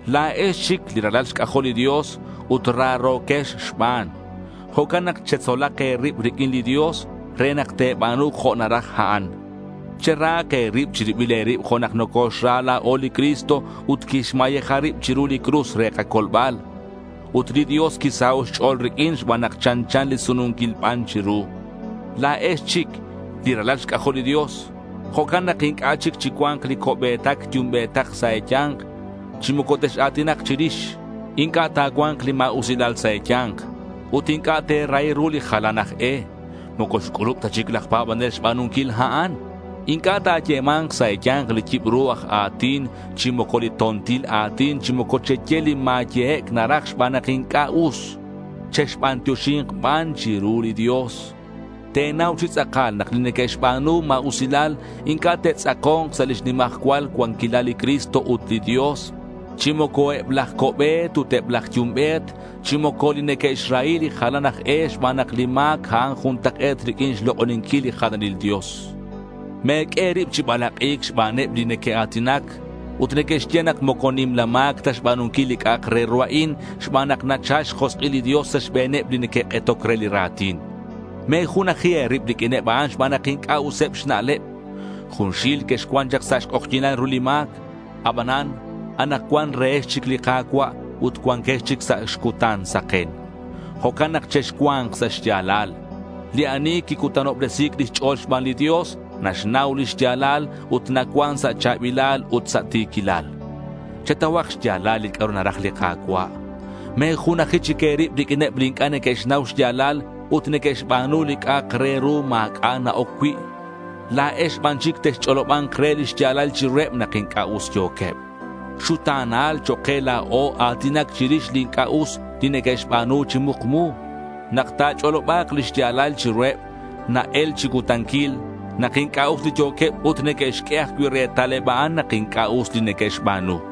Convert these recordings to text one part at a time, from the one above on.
La̱ex chic li ralal xc'ajol li Dios ut raro̱quex xban. Jo'can nak chetzolak e̱rib riq'uin li Dios re nak te̱ba̱nu jo' naraj a'an. Cherahak e̱rib chi ribil e̱rib jo' nak coxra la̱o li Cristo ut quixmayeja rib chiru li cruz re kacolbal. Ut li Dios quisaho' xch'o̱l riq'uin xban nak chanchan li sununquil ban chiru. La̱ex chic li ralal xc'ajol li Dios. Jo'can nak inc'a' chic chi cua̱nk li co'be̱tac yumbe̱tac sa' e̱ya̱nk chi moco tex-a̱tinak chirix. Inc'a' ta̱cua̱nk li ma̱usilal sa' e̱ya̱nk. Ut inc'a' te̱rahi ru li jalan aj e. Moco xc'ulub ta chic laj pa̱banel xba̱nunquil a'an. Inc'a' ta̱yema̱nk sa' e̱ya̱nk li yibru aj a̱tin chi moco li to̱ntil a̱tin chi moco cheye li ma̱yehec' naraj xban nak inc'a' us. Chexbantioxi̱nk ban chiru li Dios. Te̱nau chi tz'akal nak li neque'xba̱nu ma̱usilal inc'a' te'tz'ako̱nk sa' lix nimajcual xcuanquilal li Cristo ut li Dios. Chi moco eb laj co'be̱t ut eb laj yumbe̱t chi moco li neque'xrahi li jalan aj e xban nak li ma̱c a'an juntak'e̱t riq'uin xlok'oninquil li jalanil dios. Me̱q'ue e̱rib chi balak'i̱c xbaneb li neque'a̱tinac ut neque'xye nak moco nimla ma̱c ta xba̱nunquil li c'a'ak re ru a'in, xban nak nachal xjosk'il li Dios sa' xbe̱neb li neque'k'etoc re li ra̱tin. Me̱junaji e̱rib riq'uineb a'an xban nak inc'a' useb xna'leb. Junxil quexcuan chak sa' xk'ojyi̱nal ru li ma̱c. Abanan, anakcuan rehex chic li Ka̱cua' ut cuanquex chic sa' xcutan saken. Jo'can nak chexcua̱nk sa' xya̱lal. Li ani quicutanobresi̱c lix ch'o̱l xban li Dios naxnau lix ya̱lal ut nacuan sa' cha̱bilal ut sa' ti̱quilal. Chetauhak xya̱lal li c'a'ru naraj li Ka̱cua'. Me̱junaji chic e̱rib riq'uineb li inc'a' neque'xnau xya̱lal ut neque'xba̱nu li c'a'ak re ru ma̱c'a' na-oc cui'. La̱ex ban chic texch'oloba̱nk re li xya̱lal chiruheb nak inc'a' us yo̱queb. Xuta̱nal chok' ke la̱o a̱tinac chirix li inc'a' us li neque'xba̱nu chi mukmu. Nak ta̱ch'oloba̱k li xya̱lal chiruheb na-el chi cutanquil nak inc'a' us li yo̱queb ut neque'xq'ue ajcui' retal eb a'an nak inc'a' us li neque'xba̱nu.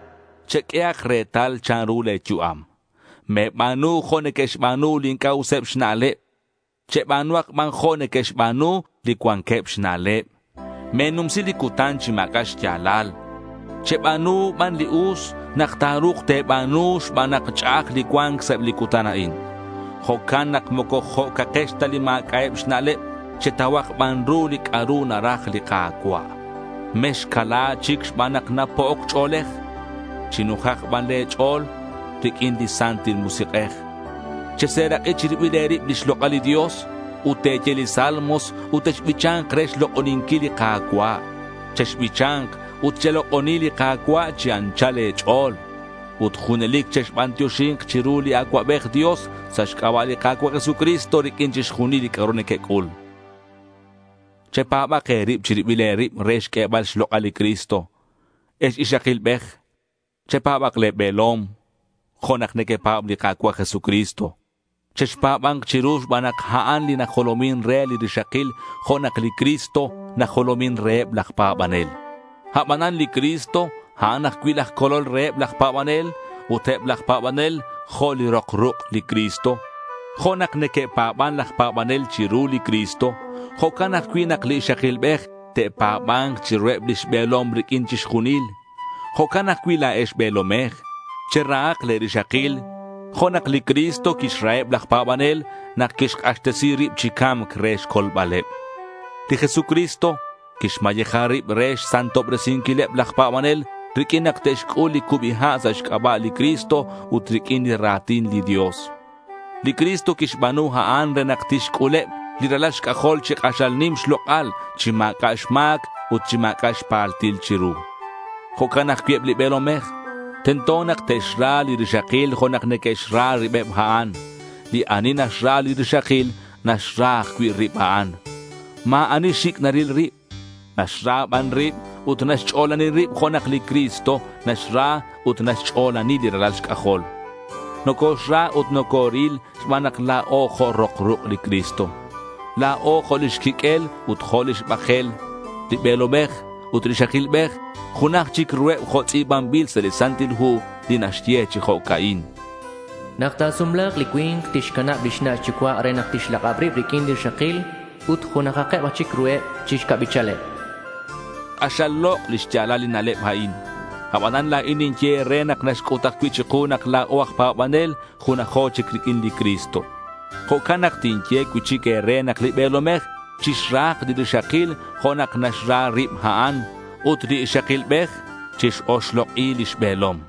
Cheq'uehak retal chanru le̱ yu'am. Me̱ba̱nu jo' neque'xba̱nu li inc'a' useb xna'leb. Cheba̱nuhak ban jo' neque'xba̱nu li cuanqueb xna'leb. Me̱numsi li cutan chi ma̱c'a' xya̱lal. Cheba̱nu ban li us nak ta̱ru̱k te̱ba̱nu xban nak ch'a'aj li cua̱nc sa' eb li cutan a'in. Jo'can nak moco jo'cakex ta li ma̱c'a'eb xna'leb. Chetauhak ban ru li c'a'ru naraj li Ka̱cua'. Mexcala chic xban nak napo'oc ch'o̱lej. Chinujak ban le̱ ch'o̱l riq'uin li Santil Musik'ej. Cheserak'i chi ribil e̱rib lix lok'al li Dios, ut te̱ye li salmos ut texbicha̱nk re xlok'oninquil li Ka̱cua'. Chexbicha̱nk ut chelok'oni li Ka̱cua' chi anchal e̱ch'o̱l. Ut junelic chexbantioxi̱nk chiru li Acuabej Dios sa' xc'aba' li Ka̱cua' Jesucristo riq'uin chixjunil li c'a'ru nequec'ul. Chepa̱bak e̱rib chi ribil e̱rib re xq'uebal xlok'al li Cristo. Ex ixakilbej, chepa̱bak le̱ be̱lom jo' nak nequepa̱b li Ka̱cua' Jesucristo. Chexpa̱ba̱nk chiru xban nak a'an li najolomin re li rixakil jo' nak li Cristo najolomin reheb laj pa̱banel. Abanan li Cristo, a'an ajcui' laj Colol reheb laj pa̱banel ut eb laj pa̱banel jo' li rok ruk' li Cristo. Jo' nak neque'pa̱ban laj pa̱banel chiru li Cristo, jo'can ajcui' nak li ixakilbej te'pa̱ba̱nk chiruheb lix be̱lom riq'uin chixjunil. Jo'can ajcui' la̱ex be̱lomej, cherahak le̱ rixakil jo' nak li Cristo quixraheb laj pa̱banel nak quixk'axtesi rib chi ca̱mc re xcolbaleb. Li Jesucristo quixmayeja rib re xsantobresinquileb laj pa̱banel riq'uin nak te'xc'ul li cubi ha' sa' xc'aba' li Cristo ut riq'uin li ra̱tin li Dios. Li Cristo quixba̱nu a'an re nak tixc'uleb li ralal xc'ajol chi k'axal nim xlok'al, chi ma̱c'a' xma̱c ut chi ma̱c'a' xpaltil chiru. Jo'can ajcui' eb li be̱lomej, tento nak te'xra li rixakil jo' nak neque'xra ribeb a'an. Li ani naxra li rixakil, naxra ajcui' rib a'an. Ma̱ ani xic' naril rib. Naxra ban rib ut naxch'olani rib jo' nak li Cristo naxra ut naxch'olani li ralal xc'ajol. Nocoxra ut nocoril xban nak la̱o jo' rok ruk' li Cristo. La̱o jo' lix quiq'uel ut jo' lix bakel. Li be̱lomej ut li ixakilbej junaj chic ruheb jo' tz'i̱banbil sa' li Santil Hu li naxye chi jo'ca'in: Nak ta̱sumla̱k, li cui̱nk tixcanab lix na' xyucua' re nak tixlak'ab rib riq'uin li rixakil. Ut junajak chic ruheb chi xca'bichaleb. K'axal lok' li xya̱lal li na'leb a'in. Abanan la̱in ninye e̱re nak naxc'ut ajcui' chiku nak la̱o aj pa̱banel junajo chic riq'uin li Cristo. Jo'can nak tinye cui'chic e̱re nak li be̱lomej chixrahak li rixakil jo' nak naxra rib a'an. Ut li ixakilbej chix-oxlok'i lix be̱lom.